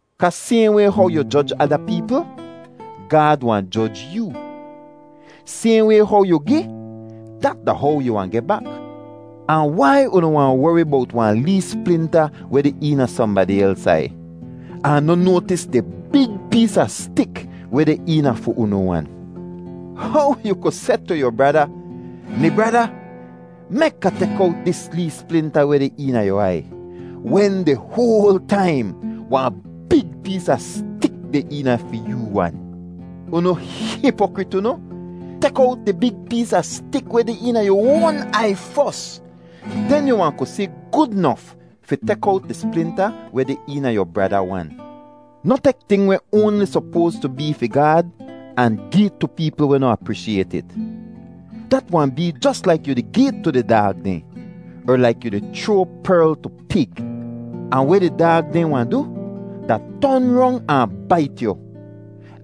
kaa sayhn way how yu joj ada peepl, Gaad wahn joj yoo. Sayhn way how yu gi, dat da how yu wahn geh bak. “Ahn wai unu wahn wori bowt wahn lee splinta weh deh eena sohnbadi els aiy, ahn noh noatis di big pees a stik weh deh eena fi unu wan? How yu ku seh tu yu brada, ‘Mi brada, mek Ah tek owt dis lee splinta weh deh eena yu aiy,’ wen di hoal taim wahn big pees a stik deh eena fi yoo wan? Unu hipokrit unu! Tek owt di big pees a stik weh deh eena yu oan aiy fos, den yu wahn ku si gud nof fi tek owt di splinta weh deh eena yu brada wan. “Noh tek ting weh oanli sopoas tu bee fi Gaad ahn gi tu peepl weh noh apreeshiayt it. Dat wahn bee jos laik yu di gi it tu di daag dehn, er laik yu di chroa perl tu pig. Ahn weh di daag dehn wahn du, da ton rong ahn bait yu,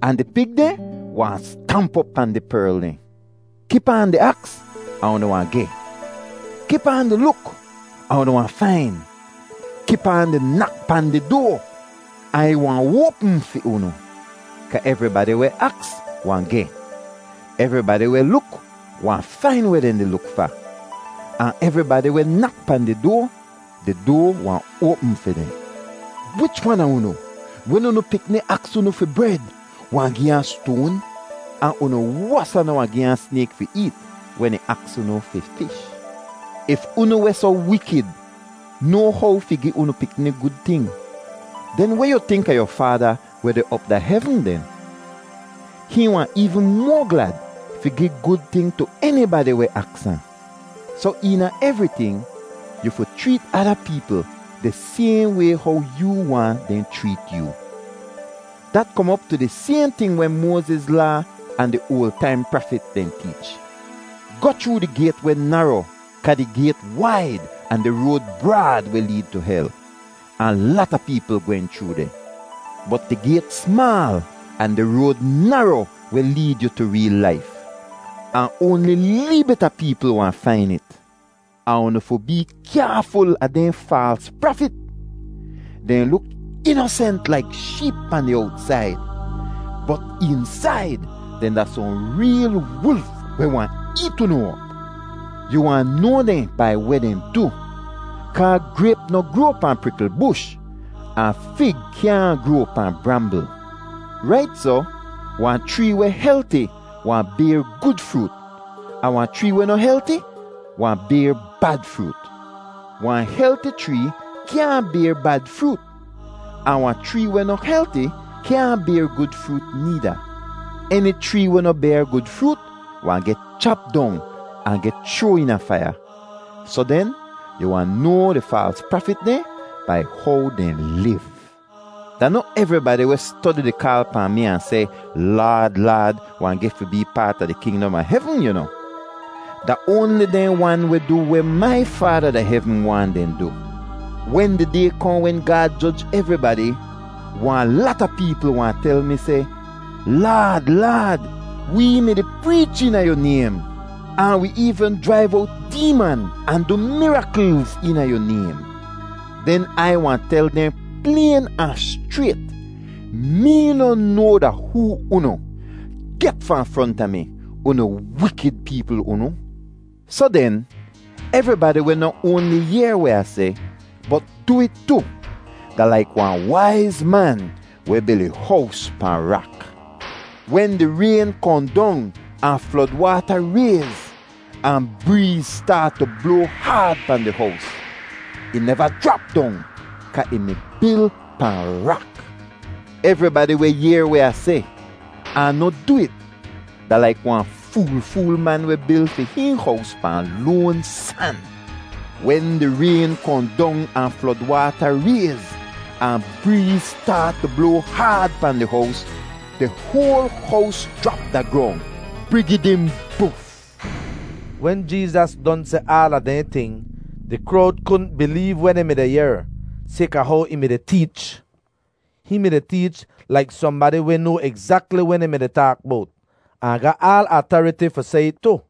ahn di pig dehn wahn stamp op pahn di perl dehn. “Kip aan di aks ahn unu wahn geh; kip aan di luk ahn unu wahn fain; kip aan di nak pahn di doa, ahn ih wahn oapm fi unu. Kaa evribadi weh aks wahn geh; evribadi weh luk wahn fain weh dehn di luk fa; ahn evribadi weh nak pahn di doa, di doa wahn oapm fi dehn. “Wich wan a unu, wen unu pikni aks unu fi bred wahn gi ahn stoan? Ahn unu wosa noh wahn gi ahn snayk fi eet wen ih aks unu fi fish. If unu weh soh wikid noa how fi gi unu pikni gud ting, den weh yu tink a yu Faada weh deh op da hevn den? Hihn wahn eevn moa glad fi gi gud ting tu enibadi weh aks ahn. “Soh eena evriting yu fi chreet ada peepl di sayhn way how yoo waahn dehn chreet yoo. Dat kom op tu di sayhn ting weh Moaziz Laa ahn di oal taim prafit dehn teech. “Goh chroo di gayt weh naro kaa di gayt waid ahn di road braad weh leed tu hel. Ahn lata peepl gwehn chroo deh. Bot di gayt smaal ahn di road naro weh leed yu tu reel laif. Ahn oanli lee bit a peepl wahn fain it. “Ahn unu fi bee kyaaful a dehn faals prafit. Dehn luk inosent laik sheep pahn di owtsaid, bot eensaid dehn da sohn reel wulf weh wahn eet unu op. Yu wahn noa dehn bai weh dehn du, kaa grayp noh groa pahn prikl bush, ahn fig kyaahn groa pahn brambl. Rait soh, wahn chree weh helti wahn bayr gud froot, ahn wahn chree weh noh helti wahn bayr bad froot. Wahn helti chree kyaahn bayr bad froot ahn wahn chree weh noh helti kyaahn bayr gud froot needa. Eni chree weh noh bayr gud froot wahn geh chap dong ahn geh chroa eena faiya. Soh den, yu wahn noa di faals prafit dehn bai how dehn liv. “Da noh evribadi weh stodi di kaal pahn mi ahn seh, ‘Laad, Laad,’ wahn geh fi bee paat a di kingdom a hevn, yu noh. Da oanli dehn wan weh du weh mai Faada da hevn waahn dehn du. Wen di Day kohn wen Gaad joj evribadi, wahn lata peepl wahn tel mi seh, ‘Laad, Laad, wee mi-di preech eena yu naym ahn wi eevn jraiv owt deeman ahn du miraklz eena yu naym.’ Den Ai wahn tel dehn playn ahn schrayt, ‘Mee noh noa da hoo unu. Get fahn fronta mi, unu wikid peepl unu!’ “Soh den, evribadi weh noh oanli yehr weh Ah seh, bot du it tu, da laik wahn waiz man weh bil ih hows pahn rak. Wen di rayn kohn dong ahn flod waata rayz, ahn breez staat tu bloa haad pahn di hows, ih neva jrap dong kaa ih mi bil pahn rak. Evribadi weh yehr weh Ah seh, ahn noh du it, da laik wahn fool-fool man weh bil fi hihn hows pahn loan san. Wen di rayn kohn dong ahn flod waata rayz, ahn breez staat tu bloa haad pahn di hows, di hoal hows jrap da grong—brigidimbuf!” Wen Jeezas don seh aala dehn ting, di krowd kudn bileev weh dehn mi-di yehr, sayka how ih mi-di teech. Hihn mi-di teech laik sohnbadi weh noa egzakli weh dehn mi-di taak bowt, ahn ga aal atariti fi seh it tu.